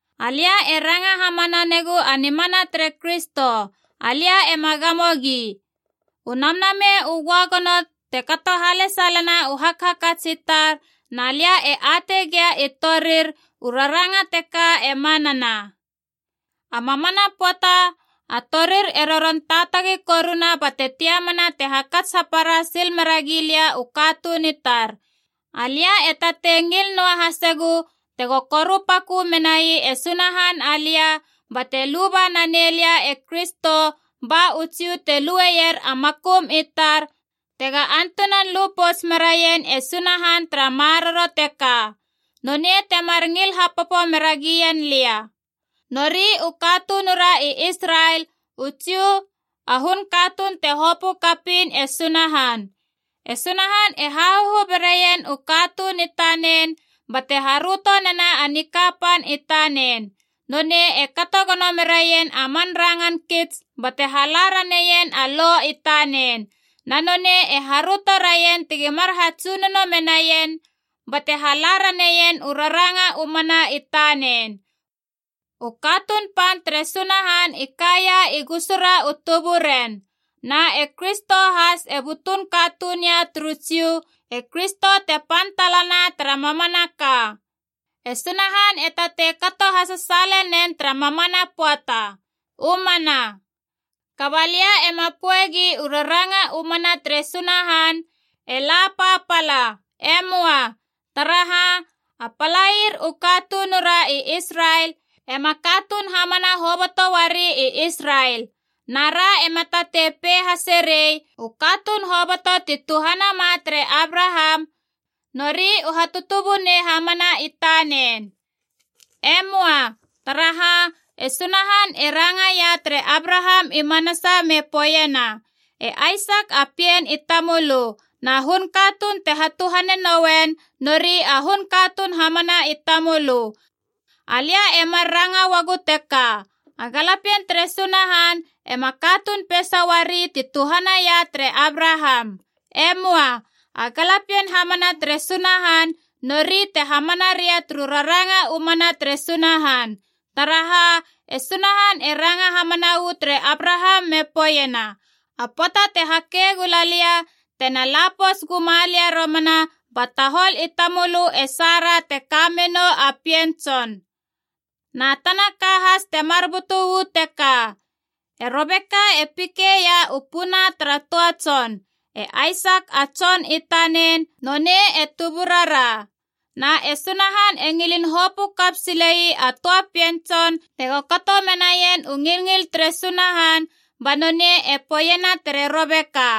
Alia e ranga hamana negu a nimana tere Kristo, alia ema gamogi. U Namnamei u Göagono te kato halesalena u hakats i tar, na lia e atei gia i torir u raranga teka e manana. A mamana pöata a torir e roron taatagi koruna bate tiamana te hakats hapara sil mera gilia u katuun i tar. Alia e tatei ngil noa hasegu tego korupakö menai e Sunahan alia bate luba nanei lia e Kristo, ba u Jiu te lueier a makum i tar, tega antunan lu pouts meraien e Sunahan tara maroro teka. Nonei temar ngil hapopo mera gien lia. Nori u katunura i Israel, u Jiu, a hun katuun te hopö kapiin e Sunahan. E Sunahan e hahahu beraien u katuun i tanen, bate haröto nena a nikapan i tanen. Nonei e kato gono meraien a man rangan kits bate hala raneien a Lo i tanen. Na nonei e haröto raien tegi mar hatsunono menaien, bate hala raneien u raranga u mana i tanen. U katuun pan tere Sunahan i kaia i gusura u tuburen. Na e Kristo has e butun katuun ia turu Jiu, e Kristo te pan talana tara mamanaka. E Sunahan e tatei kato hasasaale nen tara mamana pöata. U mana. Kaba lia ema poegi u raranga u mana tere Sunahan e la papala. Emoa. Taraha, a palair u katunura i Israel ema katuun hamana hoboto uari i Israel. Na ra ema tatei pei hase rei, “U katuun hoboto ti tuhanama tere Abraham nori u hatutubunei hamana i tanen.” E möa. Taraha, e Sunahan e rangaia tere Abraham i manasa me poeiena, “E Aisak a pien i tamölö, na hun katuun tena hatuhane nouen, nori a hun katuun hamana i tamölö.” Alia e mar ranga uagu teka: a galapien tere Sunahan ema katuun peisa uari ti tuhanaia tere Abraham. E möa. A galapien hamana tere Sunahan nori te hamana ria turu raranga u mana tere Sunahan. Taraha, e Sunahan e ranga hamana uu tere Abraham me poeiena, “A pöata te hake gula lia, tena la pouts guma lia romana, ba tahol i tamölö e Sara te ka menou a pien tson.” Na tana ka has temar butu uu teka. E Robeka e pikeia u puna tara töa tson, e Aisak a tson i tanen, nonei e tuburara. Na e Sunahan e ngilin hopö kap sile ii a töa pien tson tego kato menaien u ngilngil tere Sunahan, ba nonei e poeiena tere Robeka,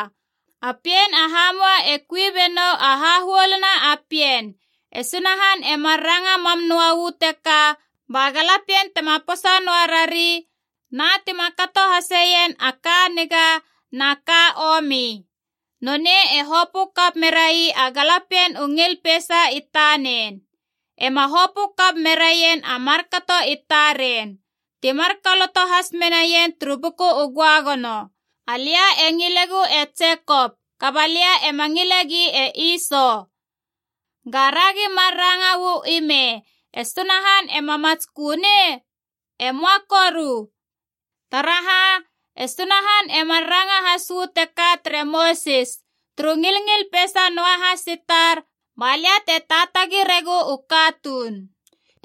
“A pien a hamua e kui benou a hahuoluna a pien.” E Sunahan e mar ranga mam noa uu teka ba galapien tema posa noa rari, na tima kato haseien a ka niga na ka omi. Nonei e hopö kap merai a galapien u ngil peisa i tanen. E ma hopö kap meraien a markato i taren. Ti mar koloto has menaien turu Buku u Göagono, “Alia e ngilegu e Jekop, kaba lia ema ngilegi e Iso.” Gara gi mar ranga uu i me, e Sunahan ema matskö nei? E möa koru. Taraha, e Sunahan e mar ranga has uu teka tere Mosis, “Turu ngilngil peisa noahas i tar ba lia te taatagi regu u katuun.”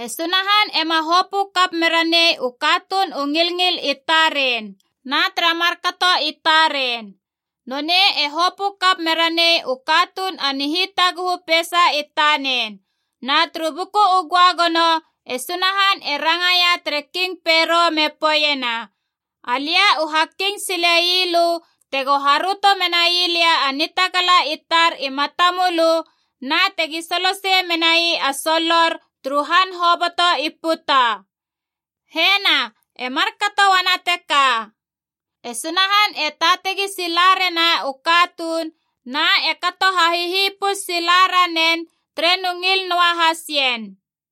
E Sunahan ema hopö kap mera nei u katuun u ngilngil i taren na tara markato i taren. Nonei e hopö kap meranei u katuun a nihitaguhu peisa i tanen. Na turu Buku u Göagono e Sunahan e rangaia tere King Pero me poeiena, “Alia u ha king sile ii lö tego haröto menai lia a nitagala i tar i matamölö, na tegi solosei menai a solor turu han hoboto i puta” Hena, e markato uana teka, e Sunahan e taatagi sila rena u katuun na e kato hahihipus sila ranen tere nu ngil noahas ien.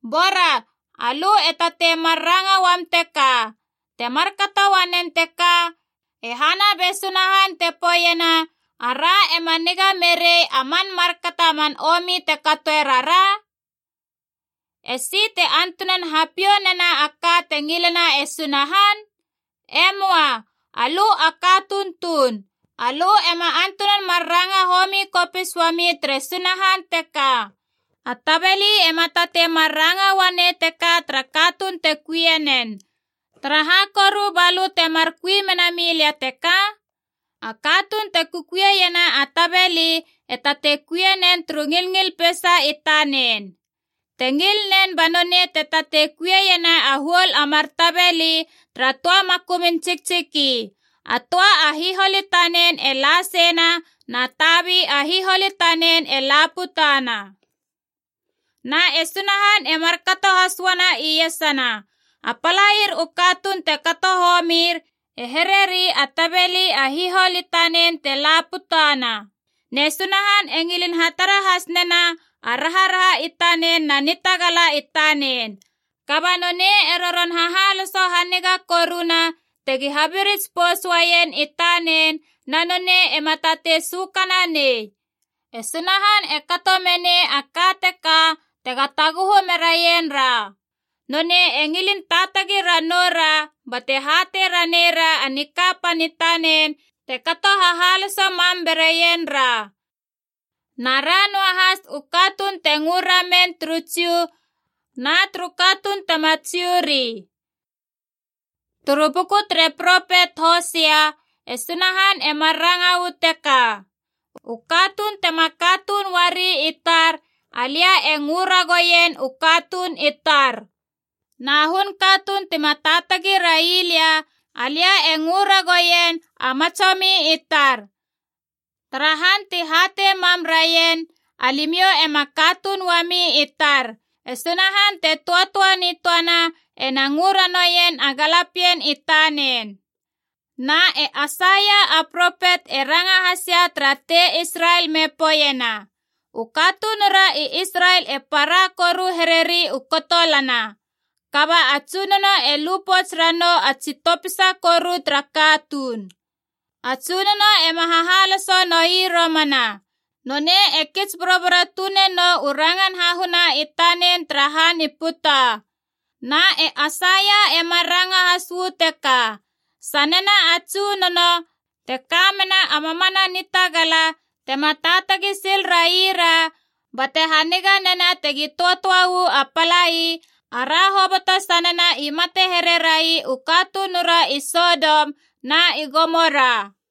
Bora alö e tatei mar ranga uam teka, “Te markato uanen teka, e hana be Sunahan te poeiena ara ema niga merei a man markato a man omi te katoe rara? Esi te antunan hapiou nena a ka te ngilena e Sunahan?” Emoa, alö a katuun tuun. Alö ema antunan mar ranga homi kopis uami tere Sunahan teka. A tabeli ema tatei mar ranga uanei teka tara katuun te kui nen, “Taraha koru balö temar kui menami lia teka?” A katuun te kukuiena a tabeli e tatei kuie nen turu ngilngil peisa i tanen. Te ngil nen ba nonei te tatei kuiena a huol a mar tabeli tara töa makumun tsiktsiki: a töa a hihol i tanen e la seina na tabi a hihol i tanen e la putana. Na e Sunahan e markato has uana iesana. A palair u katuun te kato homir, e hereri a tabeli a hihol i tanen te la putana. Ne Sunahan e ngilin hatara has nena a raharaha i tanen na nitagala i tanen. Kaba nonei e roron hahaloso haniga koruna tegi habirits pouts uaien i tanen, na nonei ema tatei sökana nei. E Sunahan e kato menei a ka teka tega taguhu meraien ra. Nonei e ngilin taatagi ranou ra bate hatei ranei ra a nikapan i tanen te kato hahaloso mam beraien ra. Na ra noa has u katuun te ngö ramen turu Jiu na turu katuun tema Jiu ri. Turu Buku tere propet Hosea e Sunahan e mar ranga uu teka: “U katuun tema katuun uari i tar, alia e ngö ragoien, ‘U katuun i tar.’ Na hun katuun tima taatagi railia, alia e ngö ragouien, ‘A matsomi i tar!’ Tara han ti hatei mam raien, ‘Alimiou ema katuun uami i tar,’ e Sunahan te töatöa nitöana ena ngö ranouien a galapien i tanen.” Na e Aisaia a propet e ranga has ia tara tei Israel me poeiena: “U katunura i Israel e para koru hereri u kotolana, kaba a Tsunono e lupouts ranou a tsi topisa koru tara katuun. A Tsunono ema hahaloso noi romana. Nonei e kits boroboro tune nou u rangan hahuna i tanen tara han i puta.” Na e Aisaia e mar ranga has uu teka: “Sanena a Tsunono, te ka mena a mamana Nitagala, tema taatagi sil raira bate haniga nena tegi töatöa uu a palai, ara hoboto sanena i mate here rai u katunura i Sodom na i Gomora.”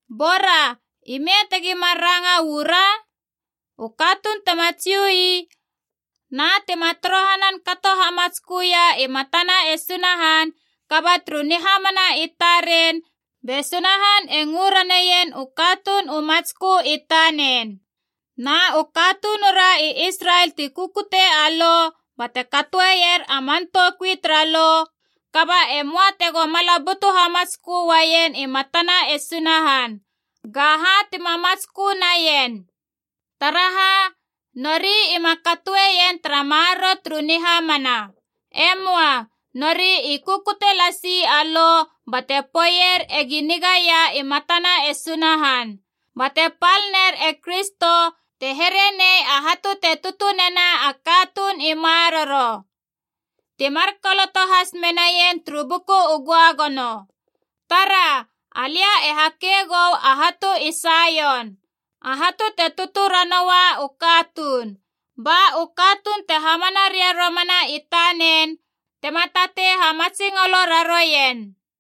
Bora ime tegi mar ranga uu ra? U katuun tima Jiu ii na tima torohanan kato hamatskö ia i matana e Sunahan, kaba turu nihamana i taren be Sunahan e ngö raneien u katuun u matskö i tanen. Na u katunura i Israel ti kukute a Lo bate katoeier a man toukui tara Lo, kaba e möa tego mala butu hamatskö uaien i matana e Sunahan. Ga ha tima hamatskö naien? Taraha, nori ima katoeien tara maroro turu nihamana. E möa. Nori i kukute lasi a Lo bate poeier egi nigaia i matana e Sunahan. Bate pal ner e Kristo te here nei a hatu te tutu nena a katuun i maroro. Ti mar koloto has menaien turu Buku u Göagono: “Tara. Alia e hake gou a hatu i Saion, a hatu te tutu ranoua u katuun. Ba u katuun te hamana ria romana i tanen tema tatei hamatsingolo raroien.”